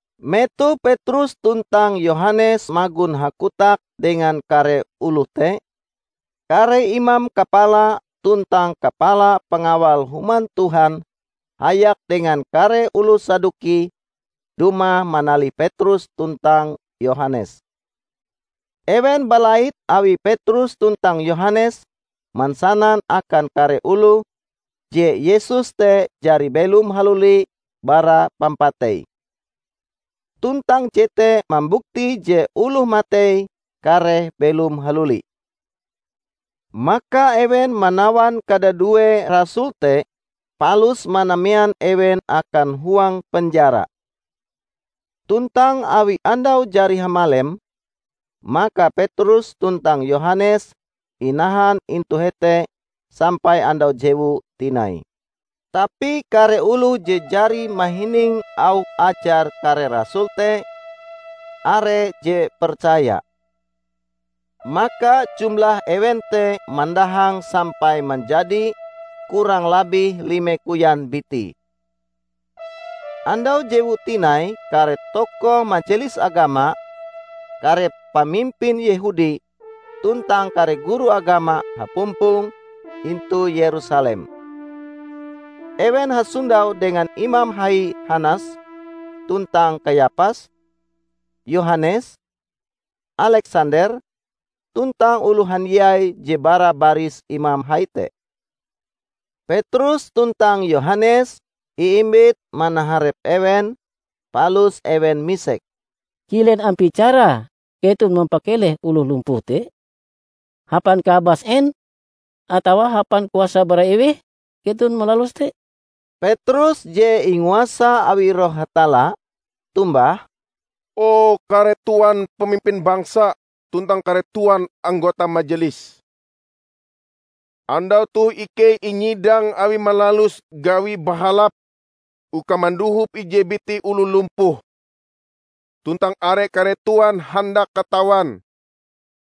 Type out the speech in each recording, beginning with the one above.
Metoh Petrus tuntang Yohanes magon hakotak dengan kare oloh te, kare imam kapala tuntang kapala pangawal Human Tuhan hayak dengan kare oloh Saduki dumah manalih Petrus tuntang Yohanes. Ewen balait awi Petrus tuntang Yohanes mansanan akan kare oloh, je Yesus te jari belom haluli bara pampatei. Tuntang jete mambukti je oloh matei kareh belom haluli. Maka ewen manawan kadadue rasul te palus manamean ewen akan huang penjara. Tuntang awi andau jari hamalem, maka Petrus tuntang Yohanes inahan intu hete sampai andau jewue tinai. Tapi kare oloh je jari mahining auh ajar kare rasul te, are je percaya. Maka jumlah ewen te mandahang sampai manjadi kurang labih lime koyan biti. Andau jewue tinai kare tokoh Majelis Agama, kare pamimpin Yehudi tuntang kare guru agama hapumpong intu Yerusalem. Ewen hasondau dengan Imam Hai Hanas, tuntang Kayapas, Yohanes, Aleksander, tuntang oloh handiai je bara baris imam hai te. Petrus tuntang Yohanes iimbit manaharep ewen, palus ewen misek, "Kilen ampie carae keton mampakeleh oloh lumpuh te? Hapan kaabas en atawa hapan kuasa bara eweh keton malalus te?" Petrus je inguasa awi Roh Hatalla, tombah, "O kare Tuan pamimpin bangsa tuntang kare Tuan anggota Majelis! Andau toh ikei inyidang awi malalus gawi bahalap uka mandohop ije biti oloh lumpuh, tuntang awi kare Tuan handak katawan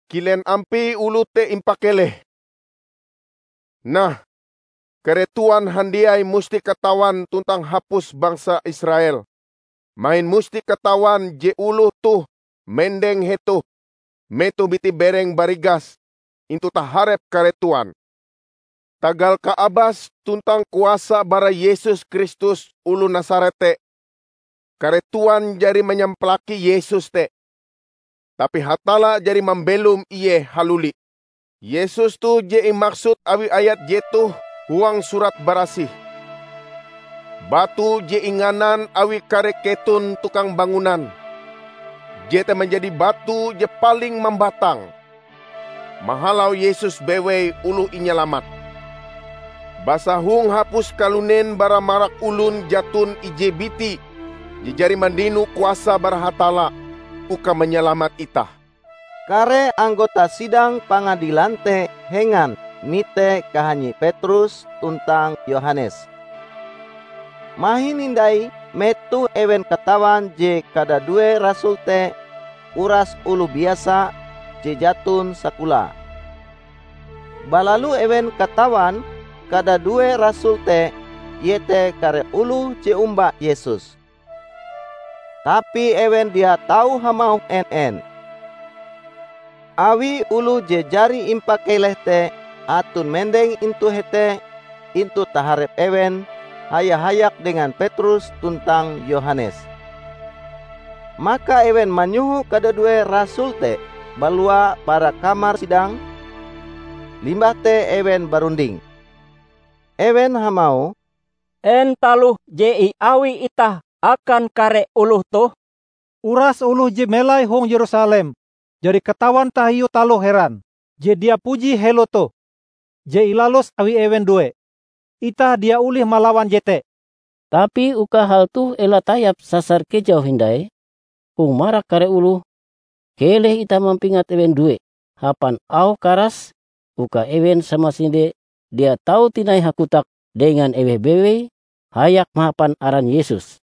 kilen ampie oloh te impakeleh. Nah, kare Tuan handiai musti katawan tuntang hapus bangsa Israel mahin musti katawan je oloh toh mendeng hetoh metoh biti-berenge barigas intu taharep kare Tuan, tagal kaabas tuntang kuasa bara Yesus Kristus oloh Nasaret te. Kare Tuan jari manyampalaki Yesus te, tapi Hatalla jari mambelom Ie haluli. Yesus toh je imaksud awi ayat jetoh huang Surat Barasih, 'Batu je inganan awi kare keton tukang bangunan, jete manjadi batu je paling mambatang.' Mahalau Yesus bewei oloh inyalamat. Basa hong hapus kalunen bara marak olon jaton ije biti je jari mandino kuasa bara Hatalla uka manyalamat itah." Kare anggota sidang Pangadilan te hengan mite kahanyi Petrus tuntang Yohanes. Mahin hindai metoh ewen katawan je kadadue rasul te uras oloh biasa je jaton sakolae. Balalu ewen katawan kadadue rasul te iete kare oloh je omba Yesus. Tapi ewen dia tau hamauh en-en, awi oloh je jari impakeleh te aton mendeng intu hete intu taharep ewen haya-hayak dengan Petrus tuntang Yohanes. Maka ewen manyoho kadadue rasul te balua bara kamar sidang, limbah te ewen barunding. Ewen hamauh, "En taloh je iawi itah akan kare oloh toh? Uras oloh je melai hong Yerusalem jari katawan tahiu taloh heran je dia puji helo toh, je ilalus awi ewen due. Itah dia olih malawan jete. Tapi uka hal toh ela tayap sasar kejau hindai hong marak kare oloh, keleh itah mampingat ewen due hapan auh karas uka ewen samasinde dia tau tinai hakotak dengan eweh bewei hayak mahapan aran Yesus."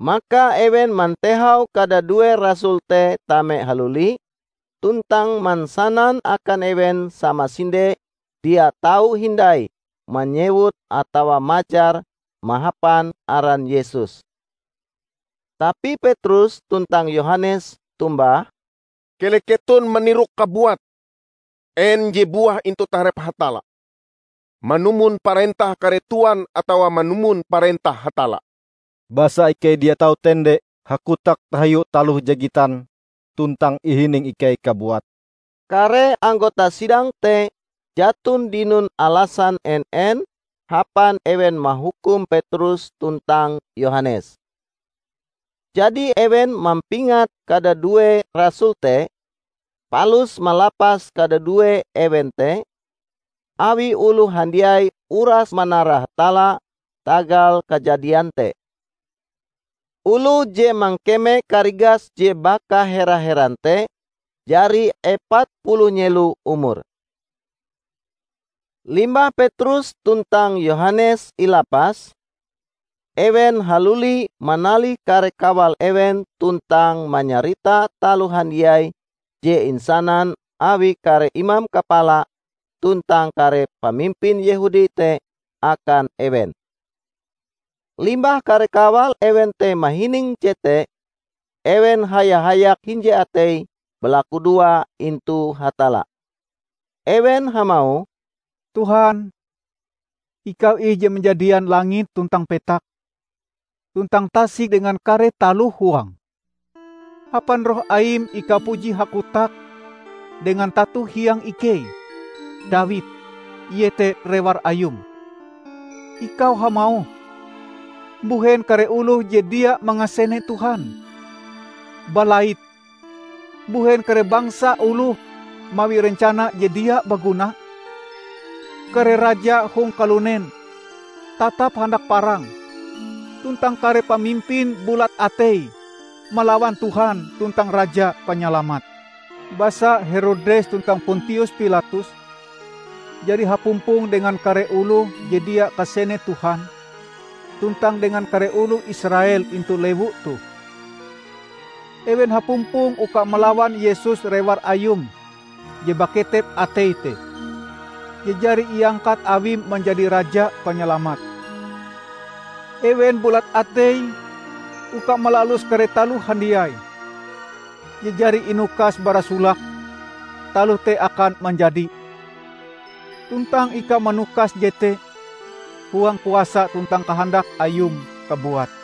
Maka ewen mantehau kadadue rasul te tame haluli tuntang mansanan akan ewen samasinde dia tau hindai manyewut atawa majar mahapan aran Yesus. Tapi Petrus tuntang Yohanes tombah, "Keleh keton manirok kabuat en je buah intu taharep Hatalla: manumon parentah kare Tuan atawa manumon parentah Hatalla. Basa ikei dia tau tende hakotak tahiu taloh je gitan tuntang ihining ikei kabuat." Kare anggota sidang te jaton dinon alasan en-en hapan ewen mahukum Petrus tuntang Yohanes. Jadi ewen mampingat kadadue rasul te, palus malapas kadadue ewen te, awi oloh handiai uras manara Hatalla tagal kajadian te. Oloh je mangkeme karigas je baka hera-heran te jari epat puluh nyelo umure. Limbah Petrus tuntang Yohanes ilapas, ewen haluli manalih kare kawal ewen tuntang manyarita taloh handiai je insanan awi kare imam kapala tuntang kare pamimpin Yehudi te akan ewen. Limbah kare kawal ewen te mahining jete, ewen haya-hayak hinje ateie balakudoa intu Hatalla. Ewen hamauh, "Tuhan, ikau ih je manjadian langit tuntang petak tuntang tasik dengan kare taloh huange. Hapan Roh Aim ikau puji hakotak dengan tato hiang ikei, Dawid, iete rewar Ayum; Ikau hamauh, 'Mbuhen kare oloh je dia mangasene Tuhan, balait; mbuhen kare bangsa oloh mawi rencana je dia baguna? Kare raja hong kalunen tatap handak parang, tuntang kare pamimpin bulat ateie malawan Tuhan tuntang Raja Panyalamat.' Basa Herodes tuntang Pontius Pilatus jari hapumpong dengan kare oloh je dia kasene Tuhan tuntang dengan kare oloh Israel intu lewu toh. Ewen hapumpong uka malawan Yesus Rewar Ayum je baketep ateie te, je jari iangkat Awim manjadi Raja Panyalamat. Ewen bulat ateie uka malalus kare taloh handiai, je jari inukas bara solake taloh te akan manjadi. Tuntang ikau manukas jete huang kuasa tuntang kahandak Ayum kabuat.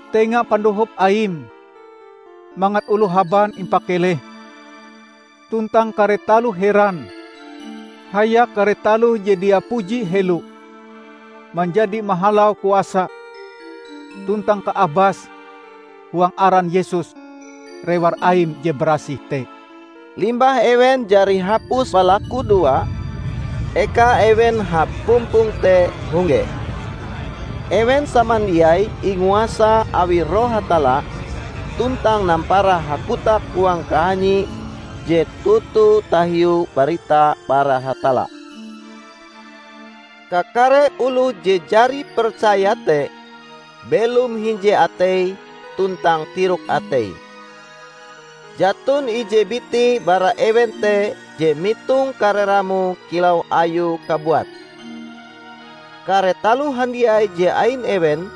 Tenga pandohop Aim mangat oloh haban impakeleh tuntang kare taloh heran hayak kare taloh je dia puji helo manjadi mahalau kuasa tuntang kaabas huang aran Yesus, Rewar Aim je barasih te." Limbah ewen jari hapus balakudoa, eka ewen hapumpong te hongge. Ewen samandiai inguasa awi Roh Hatalla, tuntang nampara hakotak huang kahanyie je toto tahiu barita bara Hatalla. Kakare oloh je jari percaya te belom hinje ateie tuntang tirok ateie. Jaton ije biti bara ewen te je mitong kare ramoe kilau ayue kabuat. Kare taloh handiai je ain ewen,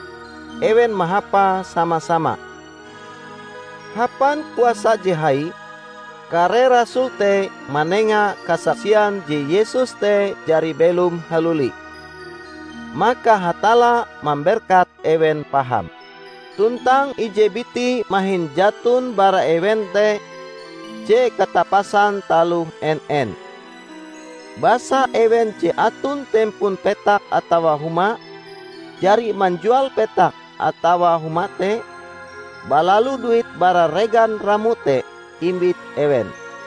ewen mahapae sama-sama. Hapan kuasa je hai, kare rasul te manenga kasaksian je Yesus te jari belom haluli. Maka Hatalla mamberkat ewen paham. Tuntang ije biti mahin jaton bara ewen te je katapasan taloh en-en. Basa ewen je aton tempon petak atawa huma, jari manjual petake atawa humae te; balalu duit bara regan ramoe te imbit ewen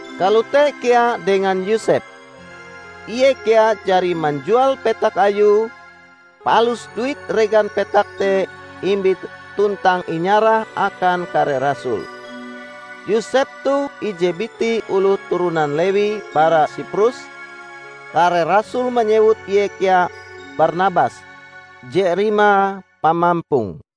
Kalote kea dengan Yosep. Ie kea jari manjual petak ayue, palus duit regan petak te imbite tuntang inyarahe akan kare rasul. Yosep toh ije biti oloh turonan Lewi bara Siprus; kare rasul manyewut ie kea Barnabas (je rimae Pamampong).